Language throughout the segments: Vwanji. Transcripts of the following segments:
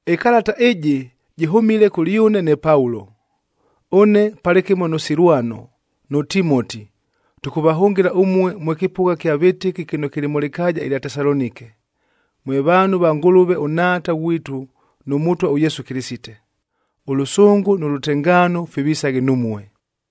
Ɨkalata ɨjɨ jɨhʉmile kʉlyʉne ne Paulo. Ʉne palɨkɨmo nʉ Silwanoa nʉ Timoti, tʉkʉvahʉngɨla ʉmue mwe kɨpʉgha kya vɨtɨki kɨno kɨlɨ mʉ lɨkaaja ɨlya Tesalonike, mwe vaanhu va Ngʉlʉve ʉNhaata ghwitu nʉ Mʉtwa ʉYesu Kɨlɨsite. Ʉlʉsʉngʉ nʉ lʉtengaano fivisaghe numue.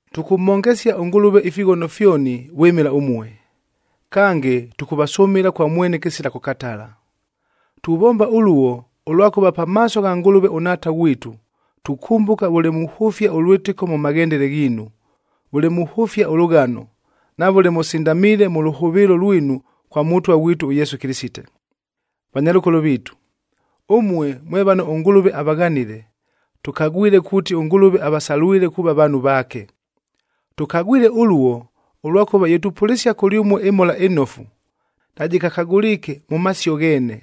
Tʉkʉmhongesia ʉNgʉlʉve ifighono fyoni vwɨmɨla ʉmue, kange tʉkʉvasʉmɨla kwa mwene kɨsila kʉkatala. Tuvomba ʉluo, ʉlwakʉva pamaaso gha Ngʉlʉve ʉNhaata ghwitu, tukʉmbʉka vʉle muhʉfia ʉlwɨtɨko mʉ maghendele ghiinu, vʉle muhʉfia ʉlʉghano, na vʉle mʉsindamiile mʉ lʉhʉvɨɨlo lwinu kwa Mʉtwa ghwitu ʉYesu Kɨlɨsite. Vanyalʉkolo viitu, ʉmue mwe vano ʉNgʉlʉve avaghanile, tʉkagwile kuuti ʉNgʉlʉve avasalwile kuuva vaanhu vaake. Tʉkagwile ʉluo, ʉlwakʉva ye tupʉlɨsia kʉlyʉmue ɨMhola ɨNofu, najɨkakagʉliike mʉ masio gheene,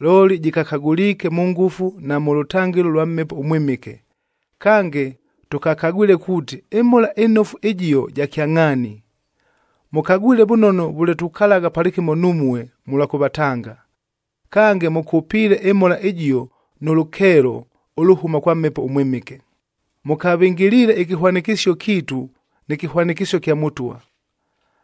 looli jɨkakagʉliike mʉ ngʉfu na mʉ lʉtangɨlo ʉlwa Mhepo ʉMwɨmɨke, kange tʉkakagwile kuuti ɨMhola ɨNofu ɨjio ja kyangʼhaani. Mʉkagwile vʉnono vʉle tukalagha palɨkɨmo numue, mʉlwa kʉvatanga. Kange, mʉkʉpiile ɨMhola ɨjio nʉ lʉkeelo ʉlʉhʉma kwa Mhepo ʉMwɨmɨke, mʉkavɨngɨliile ɨkɨhwanɨkɨsio kiitu nɨ kɨhwanɨkɨsio kya Mʉtwa.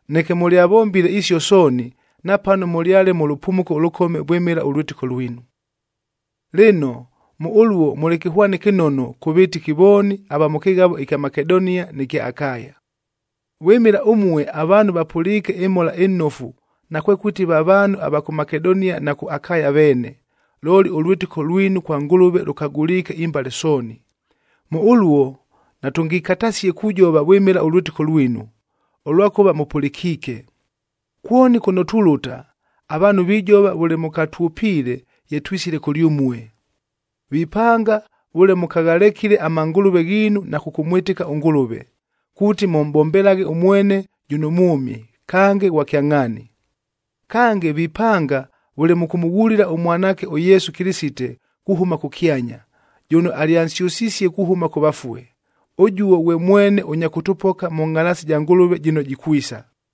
Neke mʉlyavombile isio sooni, napano mʉlyale mʉ lʉpumuko ʉlʉkome vwɨmɨla ʉlwɨtɨko lwinu. Lɨno, mʉ ʉluo mʉlɨ kɨhwani kɨnono, kʉ vɨtɨki vooni ava mʉ kɨghavob ɨkya Makedonia nɨ kya Akaya. Vwɨmɨla ʉmue, avaanhu vapʉliike ɨMhola ɨNofu, nakwekʉti va vaanhu ava kʉ Makedonia na kʉ Akaya veene, looli ʉlwɨtɨko lwinu kwa Ngʉlʉve lʉkagʉliike imbale sooni. Mʉ ʉluo natʉngikatasie kujova vwɨmɨla ʉlwɨtɨko lwinu, ʉlwakʉva mʉpʉlɨkiike. Kwoni kʉno tulʉta, avaanhu vijova vʉle mʉkatwʉpiile ye twisile kʉlyʉmue. Vipanga vʉle mʉkaghalekile amangʉlʉve ghiinu na kʉkʉmwɨtɨka ʉNgʉlʉve, kuuti mʉmʼbombelaghe ʉmwene jʉno mwʉmi, kange ghwa kyangʼhaani. Kange, vipanga vʉle mʉkʉmʉghulila ʉMwanaakec ʉYesu Kɨlɨsite kuhʉma kʉkyanya, jʉno alyansyʉsisie kuhʉma kʉ vafue. Ʉjuo ghwe mwene ʉnya kʉtʉpoka mʉ ngʼhalaasi ja Ngʉlʉve jɨno jikwisa.